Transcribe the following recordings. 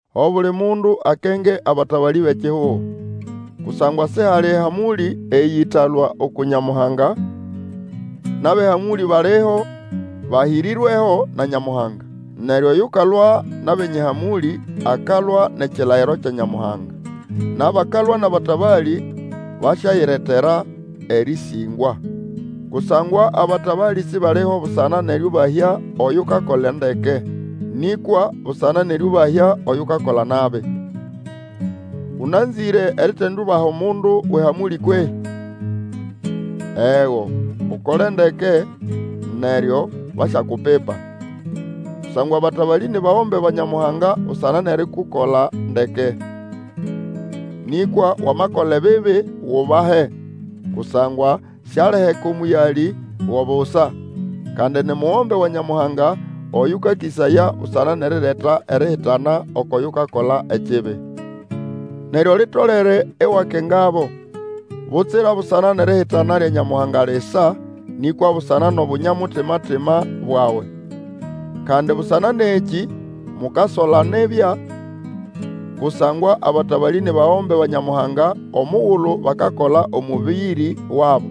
Obuli mundu akenge abatabalĩ bʼekihugo. Kusangwa sihali ehamũlĩ eyĩtalũa uku Nyamuhanga, nʼabʼehamũlĩ baliho, bahĩrĩrweho na Nyamuhanga. Neryo oyukalwa nʼabenye ehamũlĩ akalwa nʼekilayiro kya Nyamuhanga, nʼabakalwa nʼabatabalĩ basyayiretera erĩsĩngwa. Kusangwa abatabalĩ sibaliho busana nʼerĩũbahya oyukakola ndeke, nĩkwa busana nʼerĩũbahya oyukakola nabi. Ũnanzĩre eritindiubaha omundu wʼehamũlĩ kwehĩ? Ego, Ukole ndeke neryo basyakupipa. Kusangwa abatabalĩ ni bagombe ba Nyamuhanga busana nʼerikukola ndeke. Nĩkwa Wamakola ekibi, wubahe; kusangwa sialiheka omũyalĩ go busa; kandi ni mugombe wa Nyamuhanga oyũkakĩsaya busana nʼerireta erihitana oko yukakola ekibi. Neryo litolere iwakengabo, butsira busana nʼerihitana lya Nyamuhanga lisa, nĩkwa busana nʼobunya-mutima bwawe. Kandi busana nʼekĩ mukasola nibya, kusangwa abatabalĩ ni bagombe ba Nyamuhanga omugulu bakakola omũbĩrĩ wabo.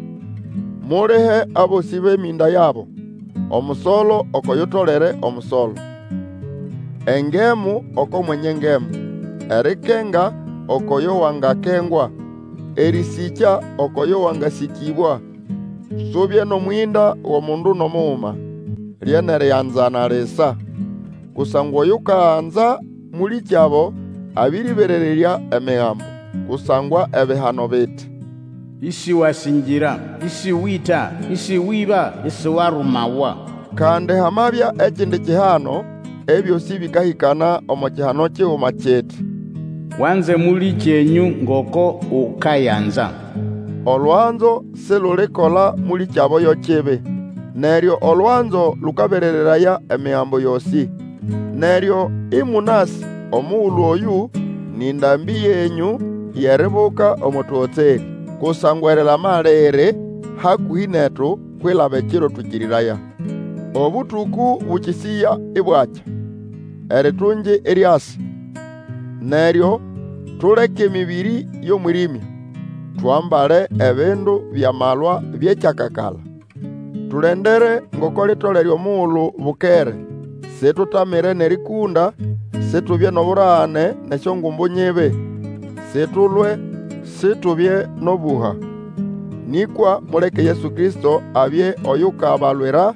Mulihe abosĩ bʼemĩnda yabo, omusolo oko yutolere omusolo, engemu oko mwenye ngemu, erikenga ukwʼoyo wangakengwa, erĩsĩkya ukwʼoyo wangasĩkĩbwa. Subye nʼomwĩnda wʼomundu nʼomuguma, lye nʼerianzana lisa; kusangwa Oyukanza mũlĩkyabo abĩrĩberererya Emigambo. Kusangwa ebihano biti, Isiwasĩngĩra, Ĩsĩwĩta, Ĩsĩwĩba, isiwarumawa. Kandi hamabya ekindi kihano, ebyosĩ bĩkahĩkana omo kihano kiguma kiti, Wanze mũlĩkyenyũ ngoko ukayanza. Olwanzo silulikola mũlĩkyabo yo kibi. Neryo olwanzo lũkaberereraya Emigambo yosĩ. Neryo ĩmũnasĩ omugulu oyũ, nĩ ndambĩ yenyũ yʼeribuka omo tũgotserĩ; kusangwa erilama liri hakũhĩ netu, kwilaba ekiro twĩkĩrĩraya. Obũtũkũ bũkĩsĩya ibwakya, eritungi iryasa. Neryo tuleke emĩbĩrĩ yʼomwĩrĩmya, twambale ebindu byʼamalwa byʼekyakakala. Tulendere ngoko litolere omugulu bukere, situtamire nʼerĩkũnda, situbye nʼoburagane nʼesyongumbu nyibi, situlwe, situbye nʼobũha. Nĩkwa muleke Yesu Kristo abye oyukabalwira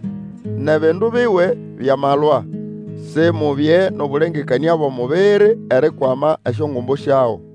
nʼebindu biwe byʼamalwa; Simubye nʼobũlengekanĩa bwʼomubiri erikwama esyongumbu syago.